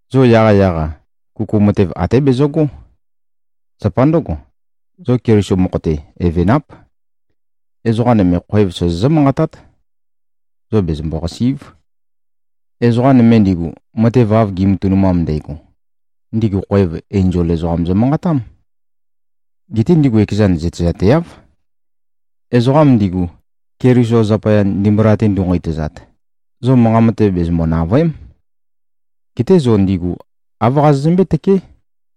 Zo yaqyaq-a, kuku matev até bezøgó. Zapa ndǿgo, zo Keliso mokho-te, evenáp. Ezoqa nøme khoev sozozǿ-manqatát. Zo bezømbo-qàsi᷄꞉v. Ezoqa nøme ndigu, matev av gi꞉matønumam ndægo, ndigu khoev, enzol ezoqam zømanqatám. Geté ndigu ekezan zøtezateáv. Ezoqam ndigu, Keliso zapaya, ndimbula-te ndu꞉-nqeitøzat, zo manqa matev bezømbo-nàvøe᷄m. Geté zo ndigu āv qazozømbé-tøké,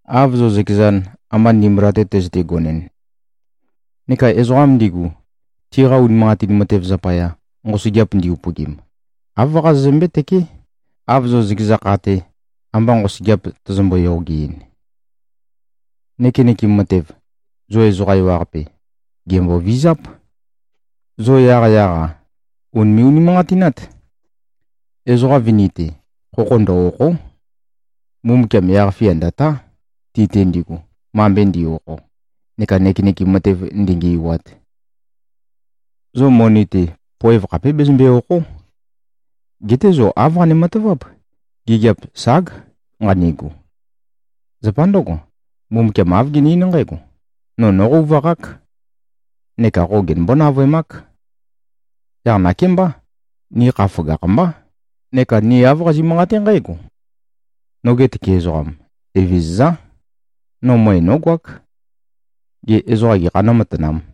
av zo zøkezan, amba ndimbula-te tøzøte-gonɨn. Neka ezoqam ndigu, tiqa unimanqatin matev zapaya, nqosøgeap ndi-upøgim, āv qazozømbé-tøké, av zo zøkeza kha-te, amba nqosøgeap tozombo-yogeɨn. Nøkenøkem matev, zo ezoqa ewaqape, gèmbovizáp. Zo yaqyaq-a, ùnime꞉-unimanqatinát. Ezoqa vini-te, khokho ndø-òkho᷄. Mbumbukiam yaq-fia ndø̀tá, ti-te ndigu, mambe ndi꞉-okho neka nøkenøkem matev ndingi꞉wat. Zo moni-te poev khapé bezømbe-òkho᷄. Geté zo āv qane-mataváp, “Gigiap ság, nqanigu.” Zapa ndǿgo, Mbumbukiam āv gene-eín nqǽgo, “No nóqøuvaqák. Neka qo genømbó-navøemák.” Yaq nakémbá, ni kha føgakh-mbá, neka ni āv qazi꞉-manqaté nqǽgo, “Noge tøke ezoqam, Evezøzá. No møe nógoák. Gê, ezoqa gekhā nǿmatanām?”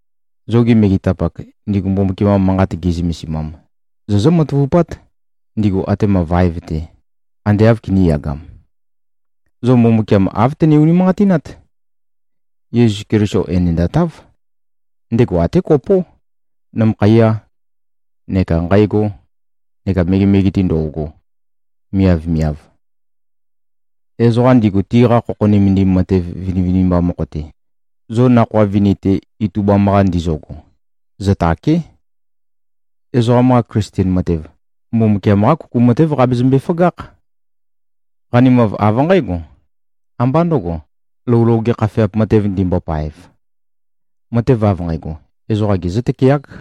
Zogi megetapak, ndigu Mbumbukiam-qa Manqat gi꞉zømesimam, zozǿ-matavupát, ndigu atema vaev-te, ande āv kinīyagam. Zo Mbumbukiam āv tøne-unimanqatinát. Yesu Keliso enendatáv. Ndego até kopó, nømøkhaiyā, neka nqægō neka megemege-te ndo꞉go, miavmiav. Ezoqa ndigu, tiqa khokho nømendim matev vinivinimba mokho-te, zo nakhoa vini-te itubam-qa ndizøgo, zøtàke᷄. Ezoqam-qa Klisten matev, Mbumbukiam-qá kuku matév qabezømbe-føgákh. Qanimav av nqǽgo. Ambá ndøgo, lou loge khafeap matev ndimbopaev. Matev av nqægo, ezoqa gezǿ-tøkeák.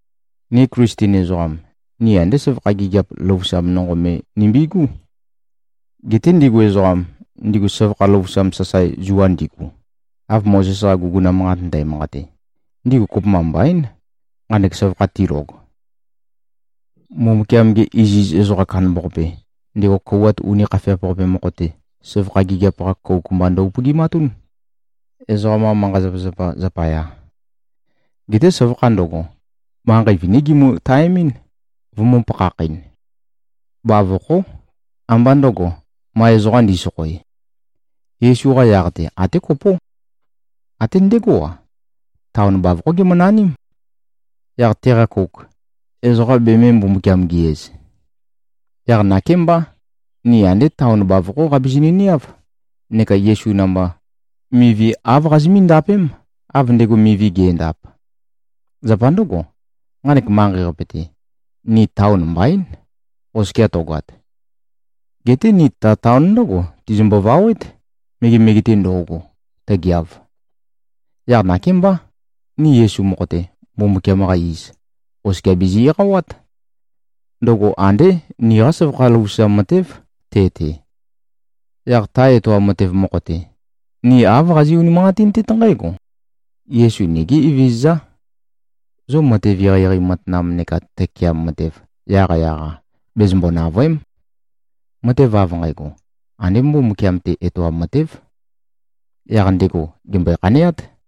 Ni Klisten ezoqam, ni andé søvakha gigiap løvusam nonqo me nimbigú. Geté ndigu ezoqam, ndigu søvakha løvusam sasae zua ndigu, av Mozes-qa guguna manqat ndæmanqate, ndigu kopømba mbaín, nqanek søvakha tilog. Mbumbukiam-ge iziz ezoqa kandambaqape, ndego kouwat uni khafeap-qape mokho-te, søvakha gigiap-qa kouk mba ndø-upøgimatún, ezoqam-qa manqa-zapazapa zapaya. Geté søvakha ndøgo, manqei viní gimø-taemín, vømø̄-pakhakh-ɨn. Bavokhó, ambá ndøgo, ma ezoqa ndi꞉sokhoe. Yesu-qa yaq-te, até kopó. Até ndegó-a, taon bavokhó gemønaním. Yaq teqa kouk, ezoqa bemē-Mbumbukiam-gi-iz. Yaq nakémbá, ni andé taon bavokhó qabizinø-niáv, neka Yesu namba, mivi āv qazimí-ndapém, av ndego mivi ge꞉ndap. Zapa ndǿgo, nqanek manqei-qape-te, ni taon mbaín, oskia tøgoat. Geté ni ta taon ndǿgo tizimbo-vawét, megemege-te ndo꞉go, tøgeav. Yaq nakémbá, ni Yesu mokho-te, Mbumbukiam-qa iz, oskia bizi-eqawát. Ndøgo andé niqá søvakha løvusam matév, te-te. Yaq ta etoam matev mokho-te, ni āv qazi꞉-unimanqatintét nqǽgo: Yesu nigí Evezøzá. Zo matev eqeieqei matanam neka tøkeam matev, yaqyaq-a, bezømbo-nàvøe᷄m. Matev av nqægo, andé Mbumbukiam-te etoam matév. Yaq ndego gèmbøe-khaneát.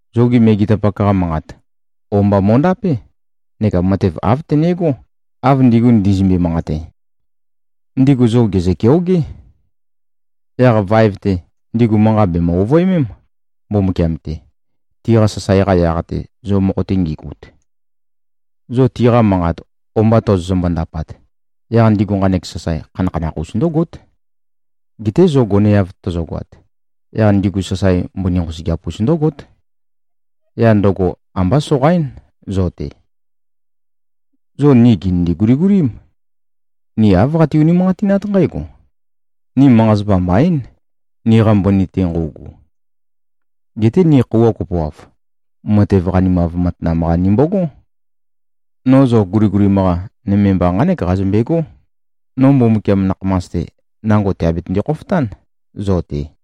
Zogi megetapak-qa manqat, o-mba mo꞉ndapé neka matev āv tønegó, av ndigu ndizømbe-manqate. Ndigu zo gèzø-keogé. Yaq vaev-te, ndigu manqa bèmø-ovøemém, Mbumbukiam-te, tiqa sasae-qa yaq-te, zo mokho-te ngigut. Zo tiqa manqat o-mba tozoto-ndapat, yaq ndigu nqanek sasae khanakhanakh-us ndǿgót. Geté zo goneav tozogoat, yaq ndigu sasae mbøni nqosøgeap-us ndǿgót. Yaq ndøgo ambá soqaín zo-te. Zo ni gìnindu-guligulím. Ni āv qati-unimanqatinát nqǽgo: Ni manqa-zapa mbaín, niqa mbøni-te nqøugu. Geté ni khøuwa kopoav, matev qanimav matanam-qa nimbogó. No zo guligulim-qa, nøme mba nqánek qazømbegó: No Mbumbukiam nakhamas-te, nango tèabetønde-khofotán zo-te.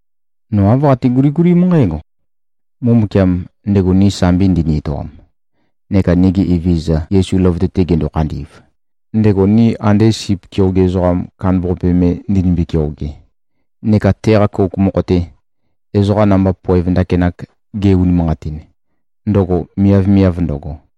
No āv qate-guligulím nqǽgo: Mbumbukiam, ndego ni sambi ndini-etoam neka nigi Evezøza Yesu løvøte-te gendo-khandi꞉v, ndego ni ande sip keoge ezoqa kandambaqape me ndinimbi-keoge, neka teqa kouk mokho-te, ezoqa namba poev ndakinak ge-unimanqatin, ndøgo miavmiav ndøgo,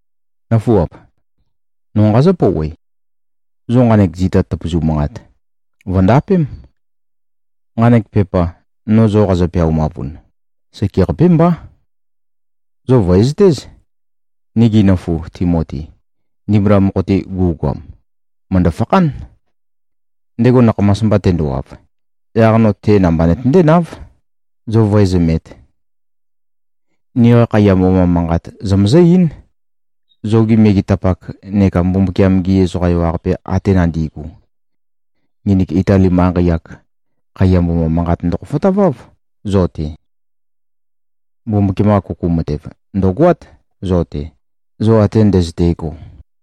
Nǿfuap! No nqazǿ-pouwe. Zo nqanek zita tøpøzu manqat, vø̀ndapém. Nqanek pepa, no zo qazø-peaumavun, sekeqapé mbá. Zo vø̀ezøtéz: Nigi nøfu Timoti, ndimbula mokho-te gu꞉goam, mø̀ndø-fakhán. Ndego nakhamas mba tendowav, yaq no te namba nøtøndé-náv, zo vǿezømēt. Niqa khaiya mboma manqat zomøzǿ-eín, zogi megetapak neka Mbumbukiam-gi ezoqa ewaqape ate nandi꞉gu. Nginik Itali manqei-ak, khaiya mboma manqat ndøkhofotaváv, zo-te. Mbumbukiam-qa kuku matev, ndø̀goát zo-te, zo ate ndøzøte꞉go.